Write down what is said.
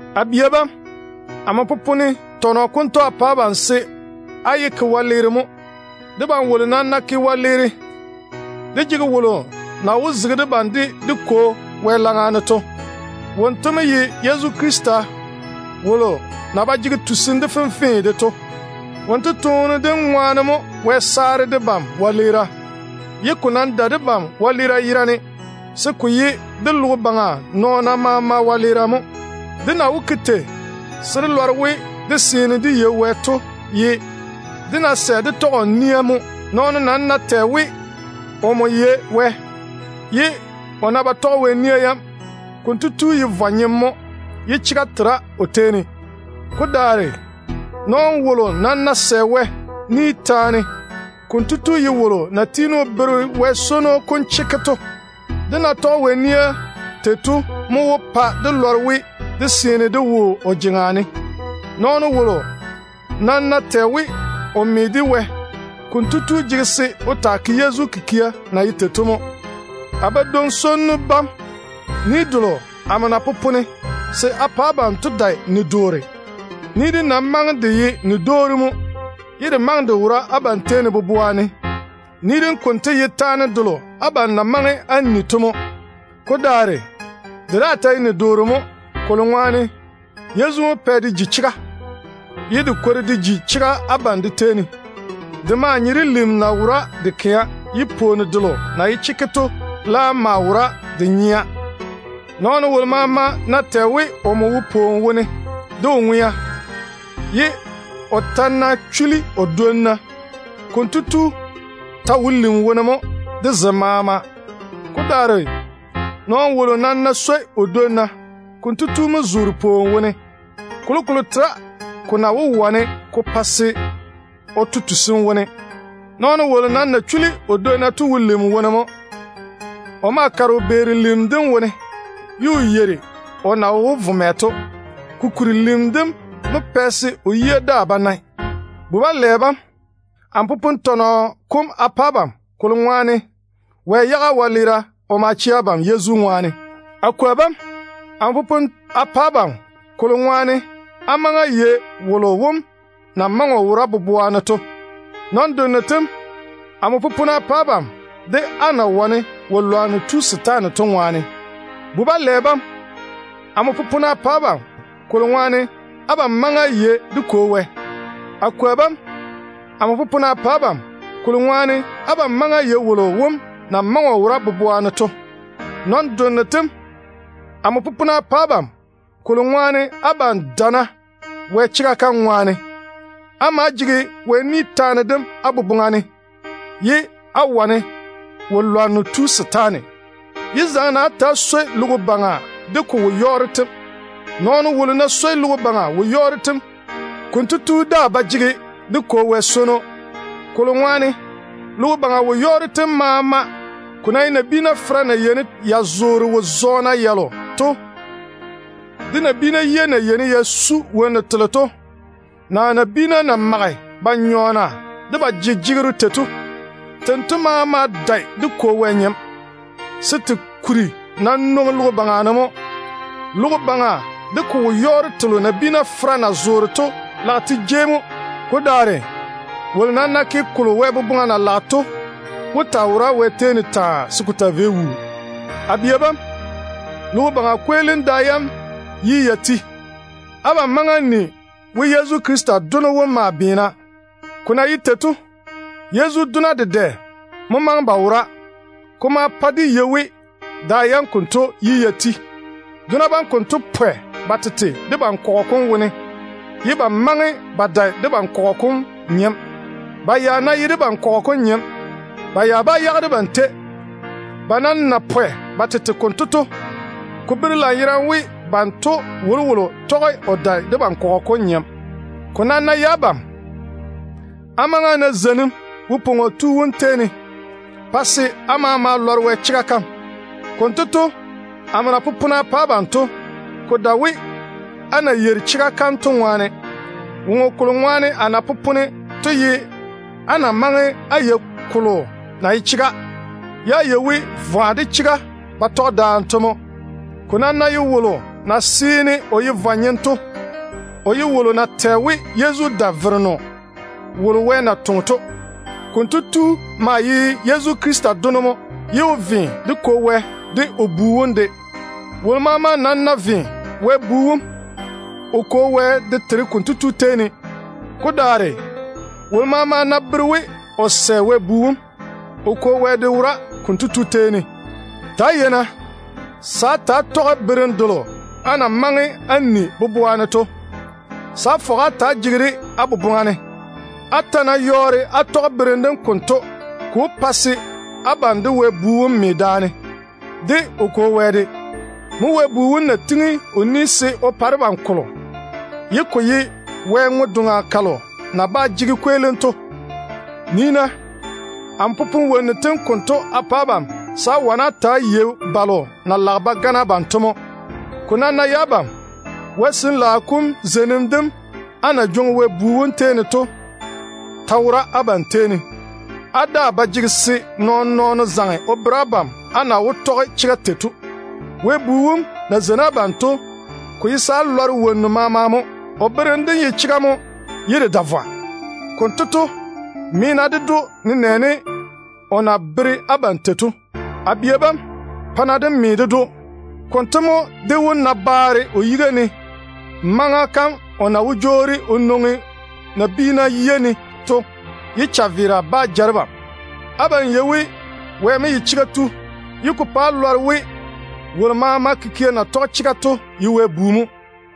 A bia bam, amo popone tɔnɔ konto a pa abam se á yé ta‑á ke wɛleere mo. Debam wolo nam ná ke wɛleere, dé jege wolo na wó zege debam de dé Kwo Wɛ laŋa ne o fɔge debam to. Wonto mo ye Yezu Krista na yɔɔre o ye chega tu to. Wonto toone dem ŋwaane mo Wɛ saare debam wɛleera, ye ko nam dae debam wɛleera yerane, se ko ye de logo baŋa nɔɔna maama wɛleera mo. Dé na wó ke tei se dé lɔre we dé seene dé me de Wɛ to ye dé ná sɛ dé tɔge o nia mo. Nɔɔno nam ná tɛ o we omo yei Wɛ, ye o ná ba toŋe o tɔge Wɛ nia yam, konto tu ye vwa-nyem mo, ye chega tera o tei ne. Ko daare nɔɔno wolo nam ná sɛ Wɛ ni taane, konto tu ye wolo na tiini o bere Wɛ swono kom chekke to mo. Dé ná tɔge Wɛ nia tei to mo wó pa dé lɔre we, dé seene dé wo o jeŋa ne. Nɔɔno wolo nam ná tɛ o we, o me de Wɛ, konto tu jege se o taa tɔge Yezu nɛ-bwora na ye tei to mo. A badwoŋ-swonnu bam, ni delo amo na popone se a pa abam to dae ni-doore. Ni dem nam maŋe de ye ni-dwoori mo, ye de maŋe de wora abam tei ne boboa ne. Ni dem konto ye taane delo abam na maŋe á ni to mo. Ko daare, de daa ta ye ni-doore mo, kolo ŋwaane Yezu mo pɛ de ji chega, ye de kwori de ji chega abam de tei ne. De maa nye de lim na wora de kɛa, ye pwooni delo na ye chekke to laam maa wora de nyea. Nɔɔno wolo maama ná tɛ o we, omo wo pwooni wone de o ŋwea, ye o ta ná chuli o dwonna, konto tu ta wo lim wone mo de zem maama. Ko daare nɔɔno wolo nam ná swoi o dwonna, konto tu mo zoore pwooni wone. Kolokolo tera ko na wó wane ko pa se o to tusim wone. Nɔɔno wolo nam na chuli o dwonna to wo lim wone mo. O maa kare o beera lim dem wone, ye o yeiri o na wó vo mɛ to, kokuri lim dem mo pɛ se o yia daa ba nae. A bia bam, amo popone tɔnɔ kom a pa abam, se á lɔre we Wɛ yage á wɛleera o ma chɛ abam Yezu yere ŋwaane. A kwoa bam, amo popone a pa abam, á na maŋe á yei wolo wom na maŋe o wora boboa ne to ŋwaane. Nɔn-donno tem, amo popone a pa abam, á na wane wo-lwanno tu setaane to ŋwaane. A bu-swonnu tem, amo popone a pa abam, kolo ŋwaane abam maŋe á yei dé Kwo Wɛ. A kwoa bam, amo popone a pa abam, á na maŋe á yei wolo wom na maŋe o wora boboa ne to ŋwaane. Nɔn-donno tem, amo popone a pa abam, abam na jege pu-dɛa to ŋwaane. Á maa jege Wɛ ni taane dem á boboŋa ne, ye á wane wo-lwanno tu setaane. Yé zaŋe-na á ta‑á swoi logo baŋa de ko wo-yɔɔro tem. Nɔɔno wolo ná swoi logo baŋa wo-yɔɔro tem, konto tu daa ba jege dé Kwo Wɛ swono. Kolo ŋwaane logo baŋa wo-yɔɔro tem maama, ko ná ye nabiina fera na yeini ya zoore wo-zɔɔna yalo to, de nabiina yia na yeini ya su wonnu telo to, naa nabiina na mage ba nyɔɔna de ba jejegero tei to, tento maama dae dé Kwo Wɛ nyem, se te kuri nam nwoŋi logo baŋa ne mo. Logo baŋa de ko wo-yɔɔro telo maama nabiina fera na zoore to lage te jei mo. Ko daare wolo nam na ke kolo Wɛ boboŋa na lage to wó taa wora taa, se ko taa vei wuu. A bia bam, logo baŋa kweelim da yam yi ya ti. Abam maŋe á ni we Yezu Krista Dono wom maa beena. Ko na ye tei to, Yezu dona dedɛ mo maŋe ba wora. Ko ma pa dé yei we da yam konto yi ya ti. Dona bam konto pwɛ ba tete debam kɔgɔ kom wone, ye ba maŋe ba dae debam kɔgɔ kom nyem. Ba ya ná ye debam kɔgɔ kom nyem, ba ya bá yage debam tei. Ba nam na pwɛ ba tete konto to, ko bere lanyerane we banto wolowolo tɔge o dae debam kɔgɔ kom nyem. Ko nam ná ye abam, á maŋe á na zeinim Wo-pwoŋo Tu wom tei ne, pa se á maama lɔre Wɛ chega kam. Konto to, amo na popone a pa abam to, ko dae we á na yeiri chega kam to ŋwaane. Woŋo kolo ŋwaane a na popone to ye á na maŋe á yei kolo na ye chega, ye á yei we vwa de chega ba tɔge daane to mo. Ko nam ná ye wolo na seene o ye vwa-nyem to, o ye wolo na tɛ we, Yezu dae Vereno wolo Wɛ na toŋe to. Konto tu maa ye Yezu Krista dono mo, ye o ve dé Kwo Wɛ de o Bu wom de. Wolo maama nam ná ve Wɛ Bu wom, o Kwo Wɛ de tere konto tu tei ne. Ko daare wolo maama ná bere we o sɛ Wɛ Bu wom, o Kwo Wɛ de wora konto tu tei ne. Ta‑á yei-na se á ta‑á tɔge berem delo á na maŋe á ni boboa ne to, se á fɔge á ta‑á jege-de á boboŋa ne. Á ta ná yɔɔre á tɔge berem dem konto, ko wó pa se abam de Wɛ Bu wom me daane, de o Kwo Wɛ de. Mo Wɛ Bu wom na pwooli se o pa debam kolo, ye ko ye Wɛ ŋwe-doŋa kalo na ba jege kweelim to. Nii-na, amo popone wonnu tem konto a pa abam, se á wane á lɔŋe balo na lage ba gane abam to mo. Ko nam ná ye abam, zeinim delo á na jwoŋi Wɛ Bu wom tei ne to ta wora abam tei ne. Á daa ba jege se nɔɔn-nɔɔno zaŋe o bere abam á na wó tɔge chega tei to. Wɛ Bu wom na zeini abam to, ko ye se á lɔre wonnu maama mo. O berem dem ye chega mo ye de dae vwa. Konto to, me-na ded‑o, nenɛɛne o na bere abam se á ta‑á ye tei to. A bia bam, pa-na dé me de Wɛ Bu Yezu Krista. Konto mo dé wó na baare o yiga ne maŋa kam o na wó jwoori o nwoŋi nabiina yiga ne to, ye chaveera bá ja debam. Abam yei we wonto mo ye chega tu, ye ko pa á lɔre we wolo maama kikia na tɔge chega to seene o ye Wɛ bu mo.